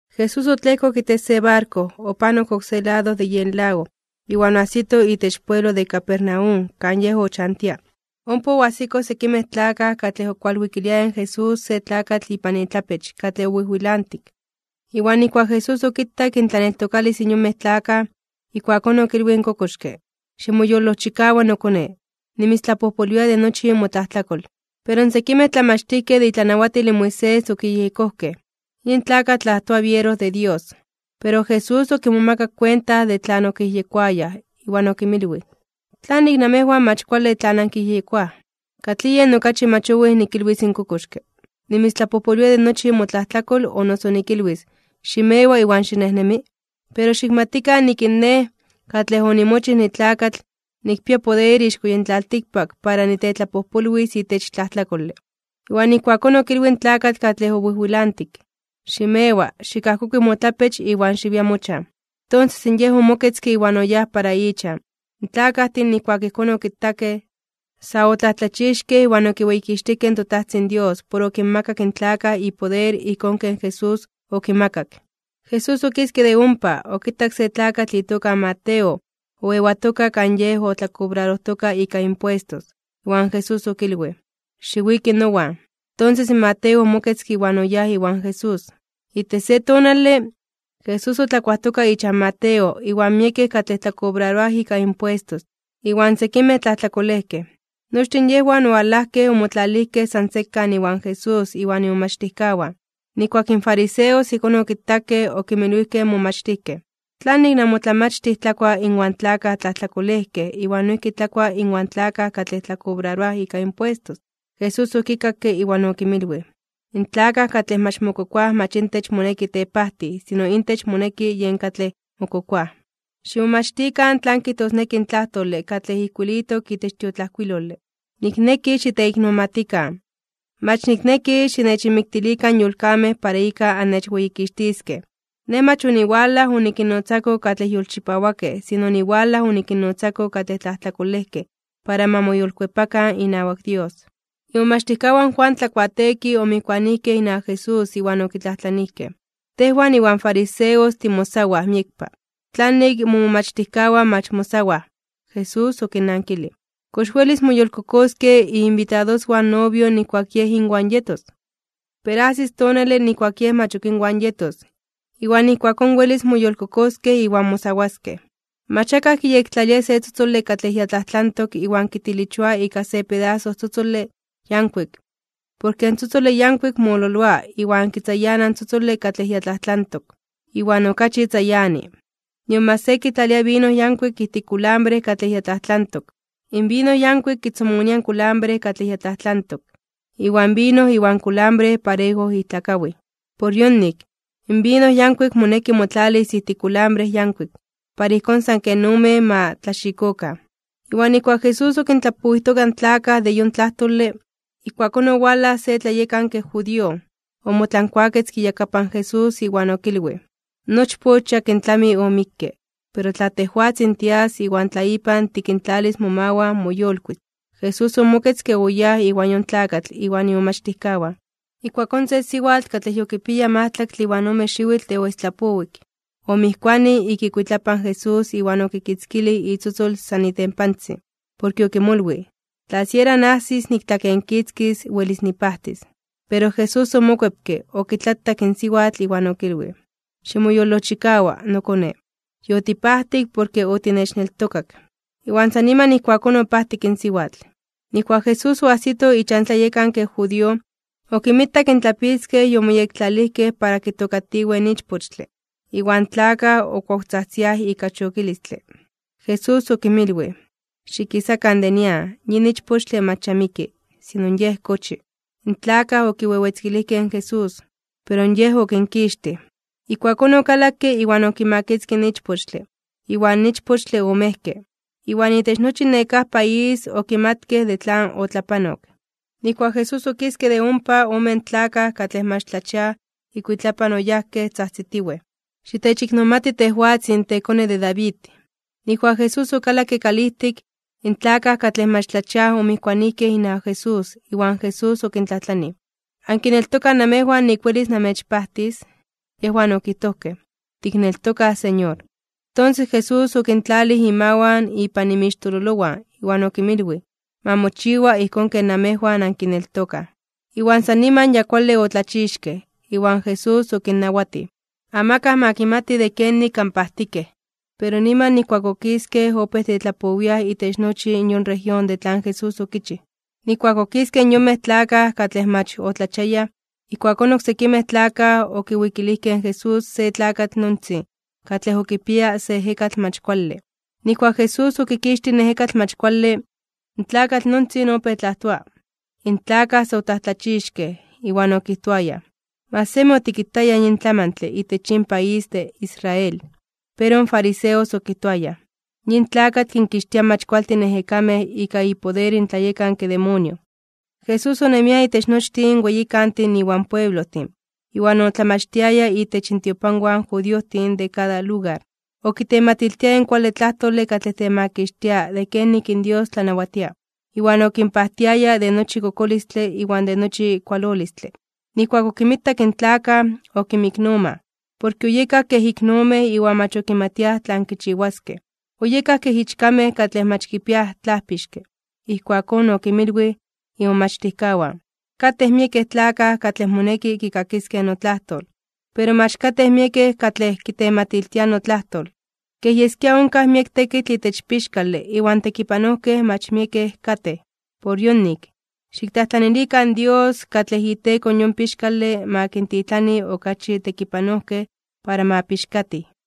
Jesús otlejkok itech se barko, opanok oksé lado de yen lago, iwan oajsito itech pueblo de Capernaum kan Yej ochantia. Ompa oajsikoj sekimej tlakaj katlej okualwikiliayaj in Jesús se tlakatl ipan itlapech katlej owijwilantik. Iwan nijkuak Jesús okitak intlaneltokalis in yonmej tlakaj, ijkuakón okilwij in kokoxke: ―Ximoyolojchikawa, nokone. Nimitztlapojpolwia de nochi motlajtlakol. Pero sekimej tlamachtijkej de itlanawatil in Moisés okiyejyekojkej: “Yin tlakatl tlajtoa biero de Dios.” Pero Jesús okimomakak kuenta de tlan okiyejyekoayaj, iwan okinmilwij: ―¿Tlanik namejwan mach kuale tlan ankiyejyekoaj? ¿Katlij yen okachi mach owij nikilwis in kokoxke: “Nimitztlapojpolwia de nochi motlajtlakol”, o noso nikilwis: “Ximewa, iwan xinejnemi”? Pero xikmatikan nik in Nej katlej onimochij nitlakatl, nikpia poder ixko yin tlaltikpak para nitetlapojpolwis itech tlajtlakole. Iwan ijkuakón okilwij in tlakatl katlej owijwilantik: ―Ximewa, xikajkokui motlapech iwan xiwia mochan. Tonses in yej omoketzke iwan oyáj para ichan. In tlakajtin nijkuak ijkón okitakej, sa otlajtlachixkej (omomajmawtijkej) iwan okiweyikixtijkej in toTajtzin Dios por okinmakak in tlakaj ipoder ijkón ken Jesús okimakak. Jesús okiske de ompa, okitak se tlakatl itoka Mateo oewatoka kan yej otlakobrarojtoka ika impuestos. Iwan Jesús okilwij: ―Xiwiki nowan. Tonses in Mateo omoketzke iwan oyáj iwan Jesús. Itech se tonale, Jesús otlakuajtoka ichan Mateo inwan miekej katlej tlakobraroaj ika impuestos, iwan sekimej tlajtlakolejkej. Nochtin yejwan owalajkej omotlalijkej san sekan iwan Jesús iwan imomachtijkawan. Nijkuak in fariseos ijkón okitakej, okinmilwijkej in momachtijkej: ―¿Tlanik namotlamachtij tlakua inwan tlakaj tlajtlakolejkej iwan noijki tlakua inwan tlakaj katlej tlakobraroaj ika impuestos? Jesús okikakke iwan okinmilwij: ―In tlakaj katlej mach mokokoaj mach intech moneki tepajtij, sino intech moneki yen katlej mokokoaj. Ximomachtikan tlan kijtosneki in tlajtole katlej ijkuilitok itech tiotlajkuilole: “Nikneki xiteiknomatikan, mach nikneki xinechinmiktilikan yolkamej para ika annechweyikixtiskej.” Nej mach oniwalaj onikinnotzako katlej yolchipawakej, sino oniwalaj onikinnotzako katlej tlajtlakolejkej para ma moyolkuepakan inawak Dios. Imomachtijkawan in Juan Tlakuateekij omijkuanijkej inawak Jesús iwan okitlajtlanijkej: ―Tejwan iwan fariseos timosawaj (tiayunaroaj) miekpa, ¿tlanik momomachtijkawan mach mosawaj? Jesús okinnankilij: ―¿Kox welis moyolkokoskej iinbitadoswan in novio nijkuak yej inwan yetos? Pero ajsis tonale nijkuak in yej mach ok inwan yetos, iwan ijkuakón welis moyolkokoskej iwan mosawaskej. ’Mach akaj kiyektlalia se tzotzole katlej ya tlajtlantok iwan kitilichoa ika se pedaso tzotzole yankuik, porke in tzotzole yankuik mololoa iwan kitzayana in tzotzole katlej ya tlajtlantok, iwan okachi tzayani. Nion mach se kitlalia vino yankuik ijtik kulambre katlej ya tlajtlantok. In vino yankuik kitzomonia in kulambre katlej ya tlajtlantok, iwan vino iwan kulambre parejo ijtlakawij. Por yonik, in vino yankuik moneki motlalis ijtik kulambre yankuik, para ijkón san ken omen ma tlaxikokan. Iwan nijkuak Jesús okintlapowijtoka in tlakaj de yon tlajtole, ijkuakón owalaj se tlayekanke judío, omotlankuaketzke iyakapan Jesús iwan okilwij: ―Nochpoch yakin tlami omikke. Pero tla tejwatzin tias iwan tla ipan tikintlalis momawan, moyolkuis (moyolitis). Jesús omoketzke, oyáj iwan yon tlakatl iwan imomachtijkawan. Ijkuakón se siwatl katlej yokipiaya majtlaktle iwan ome xiwitl de oestlapowik, omijkuanij ik ikuitlapan in Jesús iwan okitzkilij itzotzol san itempantzin. Porke okimolwij: “Tla siera najsis niktlakenkitzkis, welis nipajtis.” Pero Jesús omokuepke, okitlatak in siwatl iwan okilwij: ―Ximoyolojchikawa, nokone, yotipajtik porke otinechneltokak. Iwan san niman ijkuakón opajtik in siwatl. Nijkuak Jesús oajsito ichan tlayekanke judío, okinmitak in tlapitzkej yomoyektlalijkej para kitookatiwej in ichpochtle, iwan in tlakaj okuawtzajtziaj ika chokilistle. Jesús okinmilwij: ―Xikisakan de nian, yin ichpochtle mach ya miki, sino yej kochi. In tlakaj okiwewetzkilijkej in Jesús. Pero Yej okinkixtij. Ijkuakón okalakke iwan okimakitzkij in ichpochtle, iwan ichpochtle omejke. Iwan itech nochi nekáj país okimatkej de tlan otlapanok. Nijkuak Jesús okiske de ompa, omen tlakaj katlej mach tlachiaj ikuitlapan oyajkej tzajtzitiwej: ―¡Xitechiknomati tejwatzin, tekone de David! Nijkuak Jesús okalakke kalijtik, in tlakaj katlej mach tlachiaj omijkuanijkej inawak Jesús, iwan Jesús okintlajtlanij: ―¿Ankineltokaj namejwan nik welis namechpajtis? Yejwan okijtojkej: ―Tikneltokaj, Señor. Tonses Jesús okintlalij imawan ipan inmixtololowan, iwan okinmilwij: ―Ma mochiwa ijkón ken namejwan ankineltokaj. Iwan san niman ya kuale otlachixkej. Iwan Jesús okinnawatij: ―Amakaj ma kimati de kenik anpajtikej. Pero niman nijkuak okiskej, opéj tetlapowiaj itech nochi in yon región de tlan Jesús okichij. Nijkuak okiskej in yonmej tlakaj katlej mach otlachiayaj, ijkuakón oksekimej tlakaj okiwikilijkej in Jesús se tlakatl nontzin katlej okipiaya se ejekatl mach kuale. Nijkuak Jesús okikixtij in ejekatl mach kuale, in tlakatl nontzin opéj tlajtoa. In tlakaj sa otlajtlachixkej (omomajmawtijkej), iwan okijtoayaj: ―¡Mach semi otikitayaj yin tlamantle itech yin país de Israel! Pero in fariseos okijtoayaj: ―Yin tlakatl kinkixtia mach kualtin ejekamej ika ipoder in tlayekanke demonio. Jesús onemia itech nochtin weyikantin iwan pueblojtin, iwan otlamachtiaya itech intiopanwan in judiojtin de kada lugar. Okitematiltiaya in kuale tlajtole katlej temakixtia de kenik in Dios tlanawatia, iwan okinpajtiaya de nochi kokolistle iwan de nochi kualolistle. Nijkuak okinmitak in tlakaj, okinmiknomaj, porke oyekaj kej iknomej iwan mach okimatiaj tlan kichiwaskej, oyekaj kej ichkamej katlej mach kipiaj tlajpixke. Ijkuakón okinmilwij imomachtijkawan: ―Katej miekej tlakaj katlej moneki kikakiskej notlajtol, pero mach katej miekej katlej kitematiltiaj notlajtol. Kej yeskia onkaj miek tekitl itech pixkale iwan tekipanojkej mach miekej katej. Por yonik, xiktlajtlanilikan in Dios katlej iteko yon pixkale ma kintitlani okachi tekipanojkej para ma pixkatij.